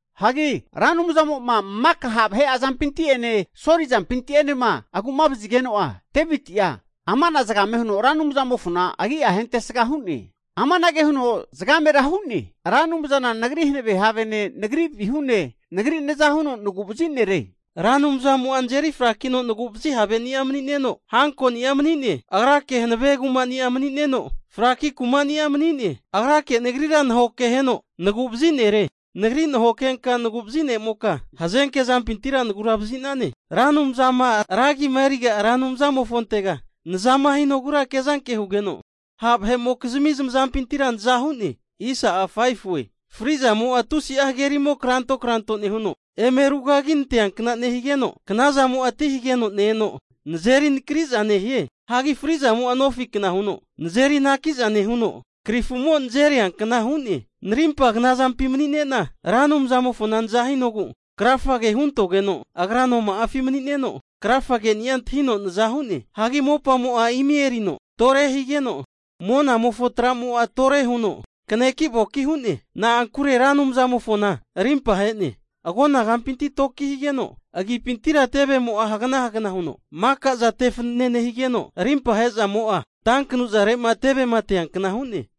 Hagi Ra Anumzamo'ma maka ha' vahe'a zamazampinti'ene Soli azampinti'enema aguma'vazigeno'a, Deviti'a ama zagame huno Ra Anumzamofona agi'a hentesaga hu'ne. Amanage huno zagamera hu'ne, Ra Anumzana nagri hanave havene, nagri vihune, nagri naza huno naguvazi nere. Ra Anumzanimo'a nazeri frakino nagu'vazi haveni'a mani'neno, hankoni'a mani'ne. Agrake hanave kuma'ni'a mani'neno, fraki kumani'a mani'ne. Agrake nagria nahokeheno nagu'vazi nere. Nagri nahokenka naguvazi ne'moka hazenke zampintira nagura vazi'nane. Ra Anumzama ra agima eriga Ra Anumzamofontega nazama hinogura kezanke hugeno, ha vahe'mokizmi zamazampintira naza hu'ne. Fri'zamo'a tusi'a hagerimo kranto kranto nehuno eme rugaginantea kna nehigeno, knazamo'a ti hageno ne-eno nazeri anakriaza nehie. Hagi frizamo'a nofikna huno nazeri anakiaza nehuno, krifumo nazeria kna hu'ne. Narimpa knazampi mani'ne'na Ra Anumzamofona naza hinogu krafage huntogeno, Agra noma'afi mani'neno krafa ke'ni'a antahino naza hu'ne. Hagi mopamo'a imi erino tore higeno, monamofo tra'mo'a tore huno kaneki'voki hu'ne. Na'ankure Ra Anumzamofona rimpa ahe'ne. Agona kampintira toki higeno, agipintira tevemo hagna hagna huno maka'za tefanene nehigeno, rimpama ahezamo'a tankanuzare'ma tevema teankna hu'ne.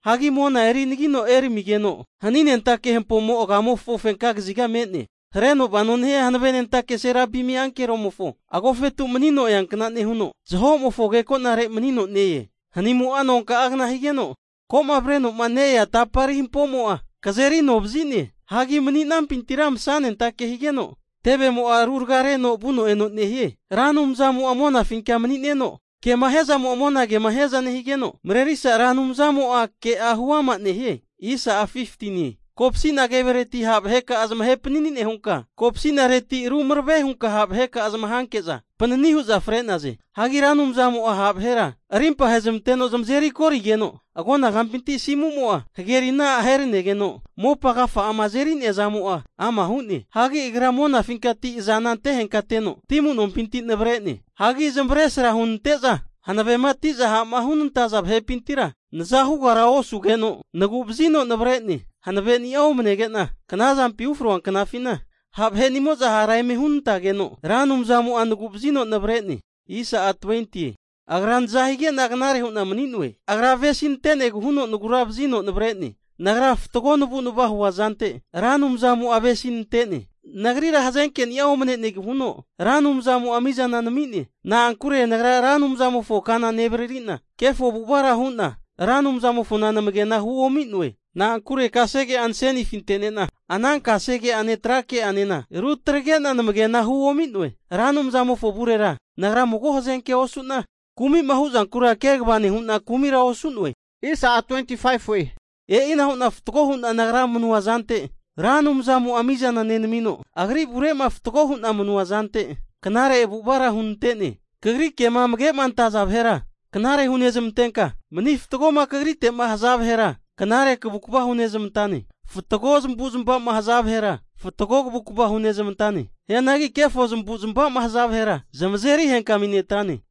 Hagi mona eri anagino eramigeno, haninentake hampomo agamofo fenka kaziga me'ne. Hareno vano nehia hanavenentake Serabim ankeromofo agofetu manino eankna nehuno, zahomofo agekonare manino ne-e. Hanimo'a nonka'agna higeno, koma avrenoma ne-ea tapari hampomo'a kazeri anovazi'ne. Hagi mani'nampintira masanentake higeno, tevemo ruragareno vuno eno nehie. Ra Anumzamo'a monafinka mani'neno kema hiazamo'a monagemo hiaza nehigeno, Marerisa Ra Anumzamo'a ke'a huama nehie. Kopsina kevereti ha' vaheka'a zamahe panani nehunka, kopsinareti rumarave hunka ha' vaheka'a zamahanke'za panini hu'za fre'naze. Hagi Ra Anumzamo'a ha' vahera arimpa ahezamanteno zamazeri korigeno, agonagampinti asimumo'a hagerina aheranegeno mopamofo agafa'ama azeri'nea zamo'a ama hu'ne. Hagi agra monafinkati azana antehenkateno ti amu'nompinti navre'ne. Hagi zamavesra hunante'za hanavema ati'za ha'ma hunenantaza vahepintira naza hugara osugeno, nagu'vazino navre'ne. Hanaveni'a omanegena knazampima ufroa knafina, ha' vahe'nimo'za hara eme hunantageno, Ra Anumzmo'a nagu'vazino navre'ne. Agra naza higena knare hu'na mani'noe. Agra avesinante'negu huno nagura vazino navre'ne. Nagra fatgo navu'nava'ma huazante Ra Anumzamo'a avesinante'ne. Nagrira hazenkeni'a omnenegu huno Ra Anumzamo'a mizana nami'ne. Na'ankure nagra Ra Anumzamofo ka nevariri'na, kefo avu'avara hu'na Ra Anumzamofona namage'na huomi'noe. Na'ankure kasege'a nasenifi ante'ne'na, ana kasege'ane tra ke'anena rutagre'na namagena huomi'noe. Ra Anumzamofo avurera nagra mago hazenkea osu'na, kumi'ma huzankura kegava nehu'na kumira osu'noe. E'ina hu'na fatgo hu'na nagra manua zante Ra Anumzamo'a mizana nenamino, agri avure'ma mani fatago hu'na manua zante knare avu'avara hunante'ne. Kagri kema amage antaza vahera knare hunezmantenka, mani fatgoma Kagrite'ma haza vahera, knare kavukva hunezamantane. Fatgo zamavu'zamava'ma haza vahera, fatgo kavukava hunezamantane. Hianagi kefo zamu'zamavama nehaza vahera, zamazeri henkami netrane.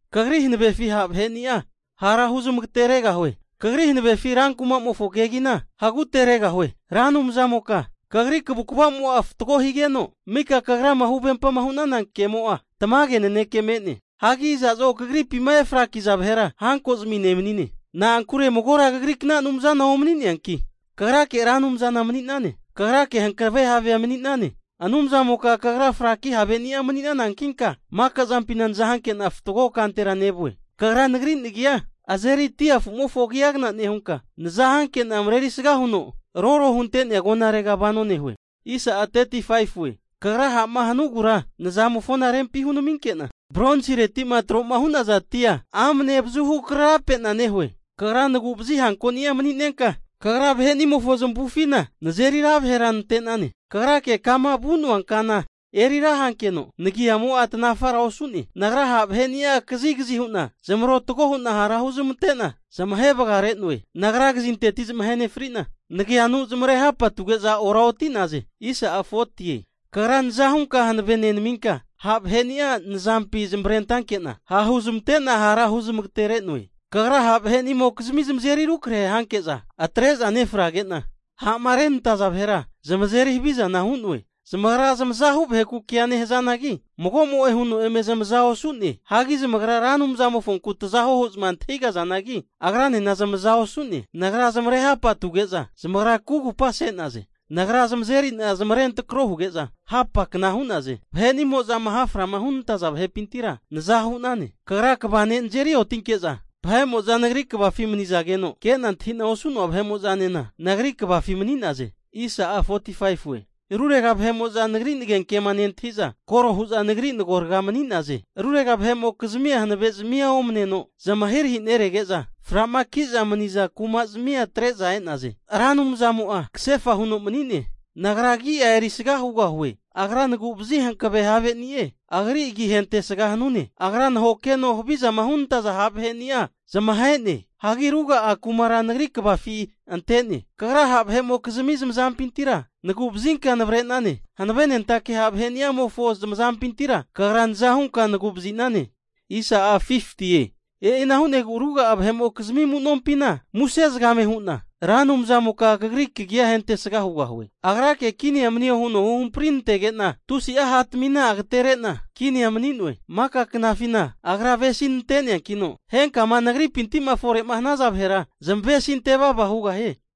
Kagri hanavefi ha' vaheni'a hara huzmageteregahue. Kagri hanavefi rankumofo kegina haguteregahue. Ra Anumzamoka Kagri kavukava zamo'a fatgo higeno, mika kagrama huvempa hu'nana kemo'a tamage naneke me'ne. Hagi iza'zo kagripima efraki'za vahera hankozami nemanine. Na'ankure magora kagrikna Anumzana omani'neanki Kagrake Ra Anumzana mani'nane. Kagrake hankave havea mani'nane. Anumzamoka Kagra fraki havegani'a mani'nanankinka, makazampina naza hanke'na fatgo kantera nevue. Kagra nagri nagia azeri dia afumofo agiagana nehunka, nazahankena mareri saga huno roro hunte'nea agonarega vano nehue. Kagra ha'ma hanugura nazamofo rempi hunaminke'na, bronsireti'ma tro hu'naza atia amne avazuhu kararapena nehoe. Kagra nagu'vazi hankoni'a mani'nenka, Kagra vahenimofo zamavufina nazeri ra vahera nante'nane. Kagrake kama vu'noa kana eri ra hankeno, nagiamo'a tanafara osu'ne. Nagra ha' vaheni'a kazigazi hu'na zamarotago hu'na hara huzamante'na zamahe vagare'noe. Nagra kazinteti zamahe nefrina, naganu zamare hapa atuge'za oraoti'naze. Kagra naza hunka hanave nenaminka, ha' vahe'ni'a nazampi zamavarentanke'na ha' huzamante'na hara huzamagatere'noe. Kagra ha' vahe'nimokizmia zamazeri rukrahe hanke'za atre'za nefrage'na, ha'marenantaza vahera zamazeri havizana hu'noe. Zamagra zamazahu vaheku kea nehazanagi mago'mo'e huno eme zamaza osu'ne. Hagi zamagra Ra Anumzamofonku tazahuo hu'zma antahige'nazanagi, Agranena zamaza osu'ne. Nagra zamarehapatuge'za zamagra kugupa se'naze. Nagra zamazeri'na zamarentrako huge'za, hapa kna hu'naze. Vahe'nimozama haframa hunantaza vahepintira, naza hu'nane. Kagra kva ne' nazeri ontinke'za, vahe'mo'za nagri kvafi manizageno, ke'na antahi'na osu'noa vahe'mo'zanena nagri kvafi mani'naze. Rurega vahe'mo'za nagri nagenkema nentahi'za, koro hu'za nagri agoraga mani'naze. Rurega vahe'mokizmia hanavezami'a omaneno zamahirahi nerege'za, frama'ki'za mani'naza kumazamia atre'za e'naze. Ra Anumzamo'a kasefa huno manine. Nagra agi'a erisga hugahue. Agra naguvazi hankave haveni'e. Agri agi ahentesga hanune. Agra nahokeno havizama hunantaza ha' vaheni'a zamahe'ne. Hagi ruga'a kumara nagri kvafi ante'ne. Kagra ha' vahe'mokizmi zamazampintira nagu'vazinka navre'nane. Hanavenentake ha' vaheni'amofo zamazampintira Kagra naza hunka nagu'vazi'nane. E'ina hu'negu ruga'a vahe'mokizmi amu'nompina muse hu'na Ra Anumzamoka Kagri kagia hentesga hugahue. Agra'a kini manio huno huhamprinantege'na tusi'a hatamina agatere'na kinia mani'noe. Maka knafina Agra avesinante'neankino, henkama nagripinti fore'ma hanaza vahera zamavesinte vava hugahie.